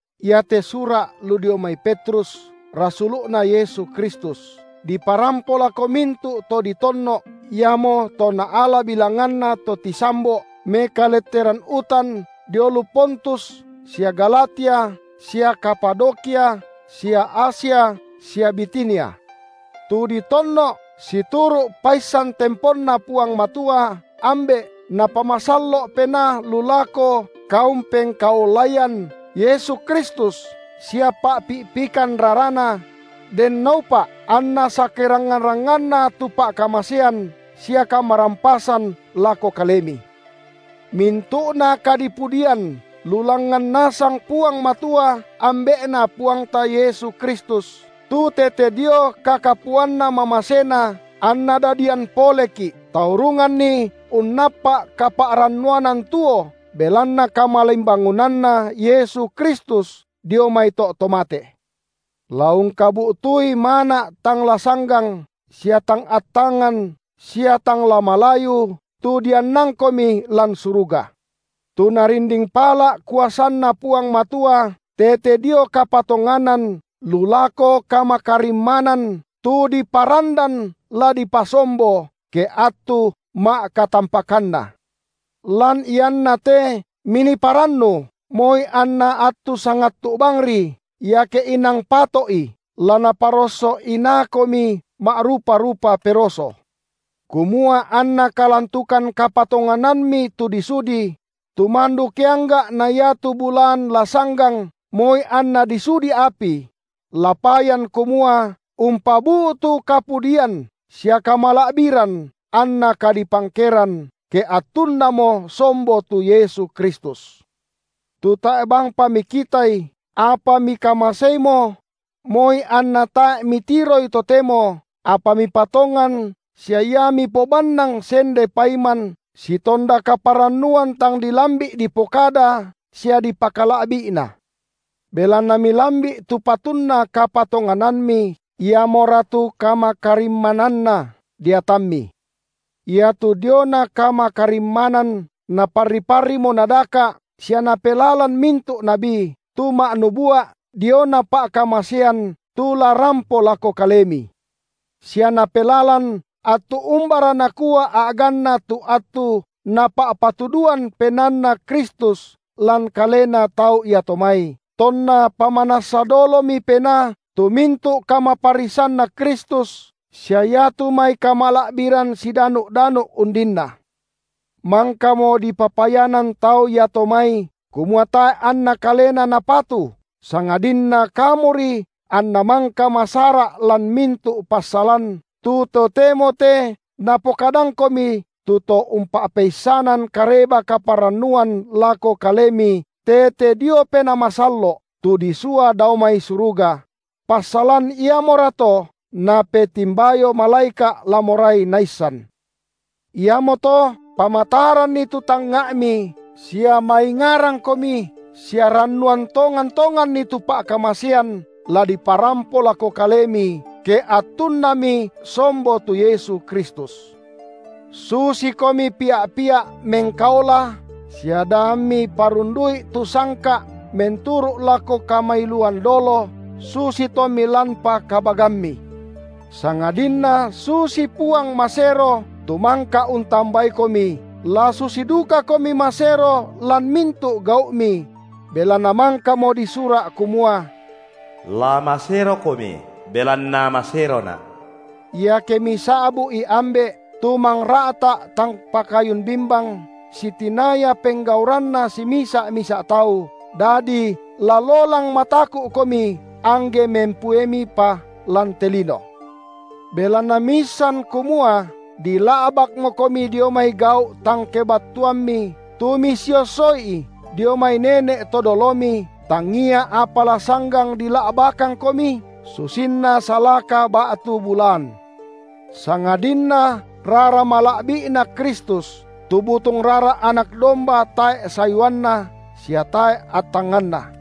Iate sura’ lu dio mai Petrus, rasulu’Na Yesu Kristus, diparampo lako mintu’ to ditonno’, iamoto naala bilanganna to tisambo’ mekaletteran utan dio lu Pontus sia Galatia sia Kapadokia sia Asia sia Bitinia, tu ditonno’ situru’ paissan temponNa Puang Matua, Ambe’, Napamasallo’ Penaa lu lako kaumpengkaolaian Yesu Kristus sia pa’pi’pikan raraNa: denno upa’ anna sakerangngan-rangnganna tu pa’kamasean sia kamarampasan lako kalemi. Mintu’na kadipudian lu langngan nasang Puang Matua Ambe’Na Puangta Yesu Kristus, tu tete dio kakapuanna mamaseNa anna dadian poleki’, taurunganni unnappa’ kapa’rannuanan tuo belanna kamalimbangunanNa Yesu Kristus dio mai to’ to mate, la ungkabu’tui mana’ tang la sanggang sia tang attangan sia tang la malayu, tu diannangkomi lan suruga, tu Narinding pala’ kuasanNa Puang Matua tete dio kapatonganan lu lako kamakarimmanan tu diparandan la dipasombo, ke attu ma’katampakanna. Lan ianna te minii parannu, moi anna attu sangattu’ bangri, iake inang pato’i, la naparosso inaakomi ma’rupa-rupa peroso, kumua anna kalantukan kapatonganammi tu disudi – tu mandu keangga’ na iatu bulaan la sanggang moi anna disudi api – la payan kumua umpabu’tu kapudian sia kamala’biran anna kadipangkeran, ke attunnamo sombo tu Yesu Kristus, tu tae’ bangpa mikitaI, apa mikamaseimo; moi anna tae’ mitiroI totemo, apa mipatongan sia Ia mipobannang sende paiman sitonda kaparannuan tang dilambi’ dipokada sia dipakala’bi’na, belanna milambi’ tu patunna kapatonganammi, iamora tu kamakarimmananna deatammi. Iatu diona kamakarimmanan naparri-parrimo nadaka’ sia napelalan mintu’ nabi; tu ma’nubua’ diona pa’kamasean tu la rampo lako kalemi, sia napelalan attu umbara nakua a’ganna tu attu Napa’patuduan PenaanNa Kristus lan kalena tau iato mai, tonna pamanassa dolomi Penaa tu mintu’ kamaparrisanNa Kristus sia iatu mai kamala’biran sidanu’-danu’ undinna. Mangkamo dipapayanan tau iato mai, kumua tae’ anna kalena napatu, sangadinna kamuri anna mangka masara’ lan mintu’ passalan, tu totemo te napokadangkomi tu to umpa’peissanan Kareba-kaparannuan lako kalemi tete dio Penaa Masallo’, tu disua dao mai suruga; passalan iamorato napetimbayo malaeka’ la morai naissan. Iamoto pamataranni tu tangnga’mi sia maingarangkomi sia rannuan tongan-tonganni tu pa’kamasean la diparampo lako kalemi, ke attunnami sombo tu Yesu Kristus. Susikomi pia’-pia’ mengkaola sia da ammi parundu’i tu sangka’ menturu’ lako kamailuan dolo, susi tommi lanpa kabagammi, sangadinna susi Puang masero tu mangka untambaikomi, la susi dukakomi masero lan mintu’ gau’mi; belanna mangkamo disura’ kumua: La maserokomi, belanna maseroNa’. Iake misa’bu’i Ambe’, tu mangra’ta’ tang pakayun bimbang sitinaya penggauranna simisa’-misa’ tau, dadi la lolang mataku’komi, angge mempuemipa lan te lino, belanna miissan kumua dila’bakmokomi dio mai gau’ tang kebattuammi, tu misiosso’i dio mai nene’ to dolomi, tangia apa la sanggang dila’bakangkomi, susinna salaka ba’tu bulaan, sangadinna rara mala’bi’Na Kristus, tu butung rara anak domba tae’ sayuanna sia tae’ attanganna.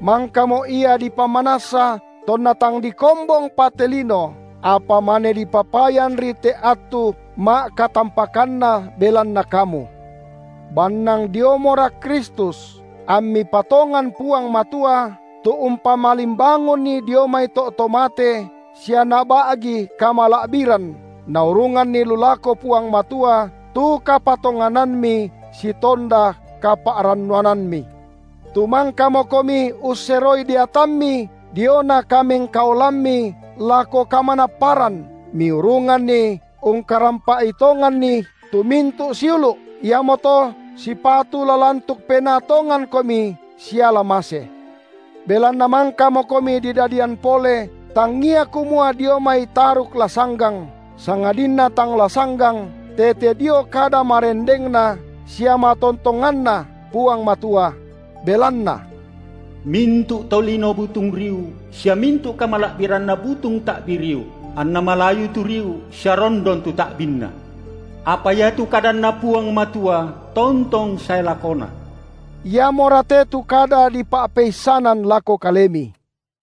Mangkamo Ia dipamanassa tonna tang dikombongpa te lino, apa mane dipapayanri te attu ma’katampakanna belanna kamu; bannang diomora Kristus, ammi patongan Puang Matua, tu umpamalimbangunNi dio mai to’ to mate sia Naba’gi kamala’biran, naurunganni lu lako Puang Matua tu kapatonganammi sitonda kapa’rannuanammi. Tu mangkamokomi usseroi deatammi diona kamengkaolammi lako kamanapparan miurunganni ungkarampa’i tonganni tu mintu’ siulu’, iamoto sipatu la lantuk penaa tongankomi siala mase, belanna mangkamokomi didadian pole tangia kumua dio mai taruk la sanggang, sangadinna tang la sanggang, tete dio kada marendengNa sia matontonganNa Puang Matua. Belanna: Mintu’ to lino butung riu, sia mintu’ kamala’biranna butung ta’bi riu; anna malayu tu riu sia rondon tu ta’binna; apa iatu kadanNa Puang Matua tontong sae lakona. Iamora te tu kada di pa’peissanan lako kalemi.